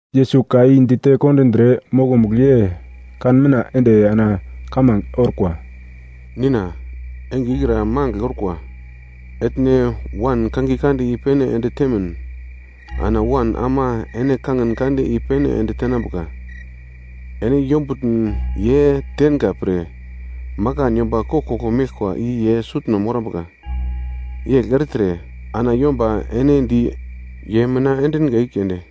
Yesus ka i dite kondindre, mokomugl ye kan mitna ende ana kamange orkwa: “Nina, enge ikra magl orkwa. Etne Wan kangiye kande i-pene ende temin, ana Wan ama ene kangin kande i-pene ende tenambuka. Ene yombutn ye tenga pre, makan yomba koglkoglo meglkwa i ye sutno morambuka, yegl ertre ana yomba ene di ye mina endinga i keunde,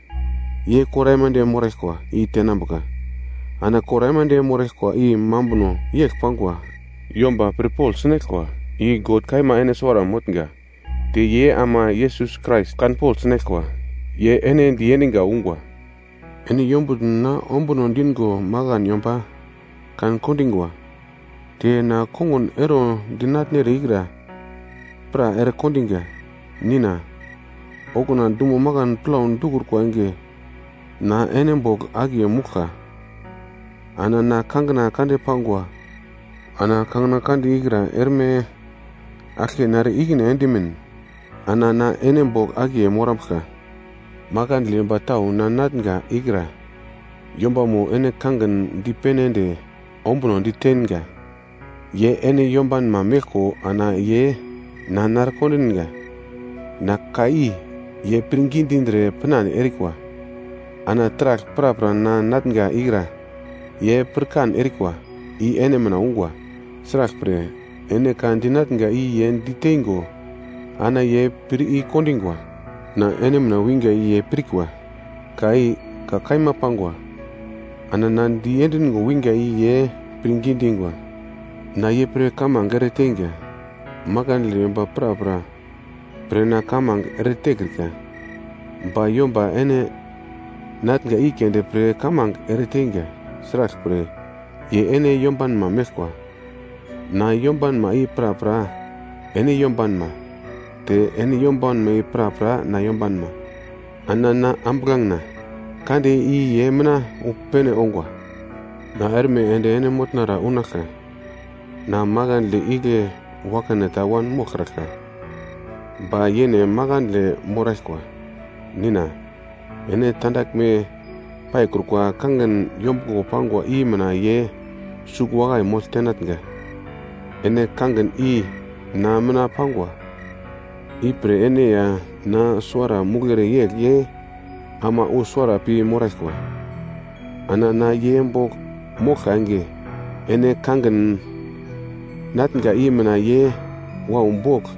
ye kor aimande moraglkwa i tenambuka. Ana kor aimande moraglkwa i mambuno yegl pangwa. Yomba pirpogl sinaglkwa, i God kaima ene suwara motnga, te ye ama Yesus Krais kanpogl sinaglkwa, ye ene diendinga ungwa. Ene yombutn na ombuno dingo makan yomba kan-kondingwa, te na kongun ero dinatnere ikra pra ere kondinga. Nina, okuna dumo makan plau dikrukwa enge na ene bogl akiye mouglka, ana na kangina kande pangwa. Ana kangina kande ikra erme aglke nare ikine endimin ana na ene bogl akiye morambuglka. “Makandle yomba tau na natnga ikra yombamo ene kangin dipene ende ombunodi teinga. Ye ene yombanma meglko ana ye na narekondinga, ana ka i ye pirngi dindre pinande erikwa. Ana taragl prapra na natnga ikra ye pirkan erikwa i ene mina ungwa. Sraglpre, ene ka dinatnga i ye diteingo ana ye pir i-kondingwa. Na ene mina winga i ye pirkwa, ka i ka kaima pangwa, ana na diendingo winga i ye pirngi dingwa. Na ye pre kamange ere teinga. Makandle yomba prapra pre na kamange eretekrika, ba yomba ene natnga i keunde pre kamange ereteinga, sraglpre ye ene yombanma meglkwa. Na yombanma i prapra ene yombanma, te ene yombanma i prapra na yombanma, ana na ambuglangena kande i ye mina wu pene ongwa. Na erme ende ene motnara unaglka, na makandle igle wakane ta wanmoglkraglka, ba ye makandle moraglkwa. Nina, ene tandaglme paikrukwa kangin yombuglo pangwa i mina ye sugl wakai mogl tenatnga, ene kangin i na mina pangwa, ipre ene ya na suwara mouglere yegl ye ama wu suwara pi moraglkwa. Ana na ye bogl moglka enge, ene kangin natnga i mina ye wau bogl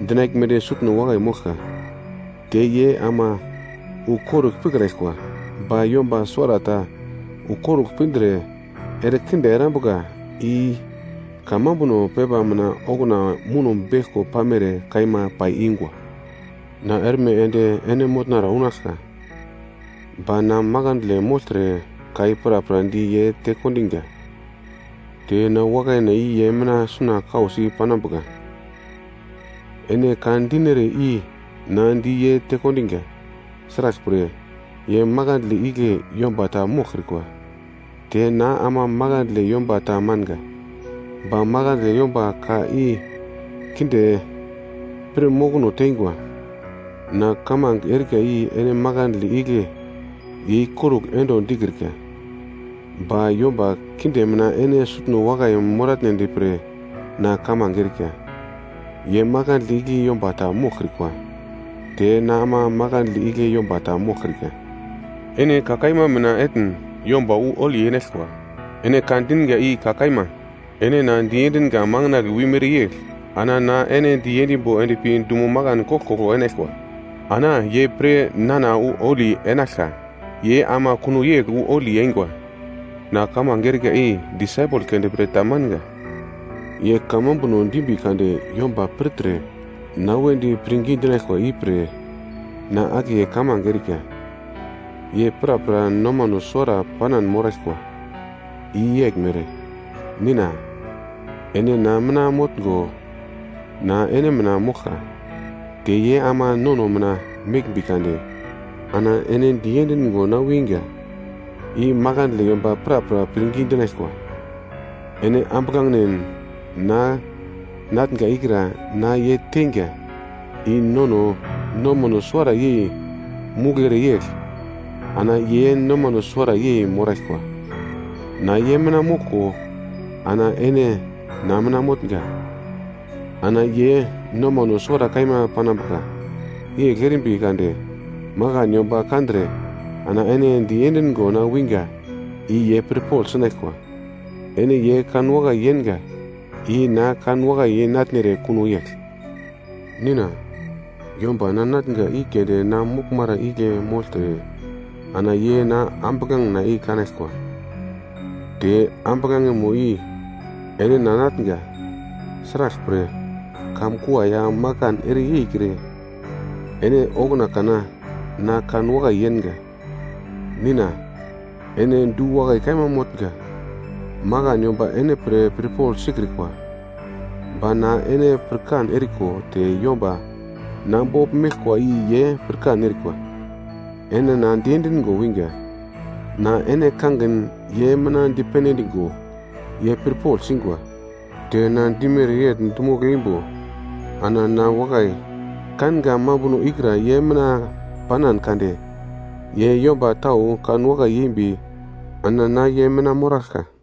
dinaglmedi sutno wakai moglka, te ye ama wu korugl pikrikwa, ba yomba suwarata wu korugl pindre erekinde erambuka, i kamambuno pepa mina okuna muno beglko pamere kaima pai ingwa. “Na erme ende ene motnara unaglka, ba na makandle mogltre ka i prapra di ye tekondinga te na wakaina i ye mina suna kausi panambuka. Ene ka dinere i na di ye tekondiga. Sraglpre ye makandle igle yomba ta moglkrikwa, te na ama makandle yomba ta manga. Ba makandle yomba ka i kinde pir mokono teingwa. Na kamange erika i ene makandle igle ye ikorugl endo dikrika. Ba yomba kinde mina ene sutno wakai moratnedi pre na kamange erika. Ye makandle igle yomba ta moglkrikwa, te na ama makandle igle yomba ta moglkrika. Ene ka kaima mina etn yomba wu holi enaglkwa, ene ka dinga i ka kaima. Ene na diendinga makandle wimere yegl ana na ye diendimbo endpi dumo makan koglkoglo enaglkwa. Ana ye pre nana wu holi enaglka, ye ama kuno yegl wu holi eingwa. “Na kamange erika i disaipel keunde pre ta manga. Ye kamambuno dimbi kade yomba pirtre na wedi pirngi dinaglkwa ipre na akiye kamange erika. Ye prapra nomano suwara panan moraglkwa, i yeglmere. Nina, ene na mina motngo na ene mina moglka. Te ye ama nono mina meglmbi kade ana ene diendingo na winga i makandle yomba prapra pirngi dinaglkwa. Ene ambuglangen na natnga ikra na ye teinga, i nono nomano suwara yei mouglere yegl ana ye nomano suwara yei moraglkwa. Na ye mina moglko ana ene na mina motnga. Ana ye nomano suwara kaima panambuka, yegl erimbi kade makan yomba kandre ana ene diendingo na winga i ye pirpogl sinaglkwa, ene ye kanwakai yenga i na kanwakai yei natnere kuno yegl. “Nina, yomba na natnga i keunde na moraglmara igle mogltre ana ye na ambuglangena i kanaglkwa, te ambuglangemo i ene na natnga, sraglpre kamkua ya makan ere yeikre ene okuna kana na kanwakai yenga. “Nina ene du-wakai kaima motnga, makan yomba ene pre pirpogl sikrikwa, ba na ene pirkan eriko te yomba na bogl meglkwa i ye pirkan erikwa, ene na diendingo winga. Na ene kangin ye mina dipene endingo ye pirpogl singwa, te na dimere yegl dimogl eimbo ana na wakai kanga mambuno ikra ye mina panan kade ye yomba tau kanwakai yembi ana na ye mina moraglka.”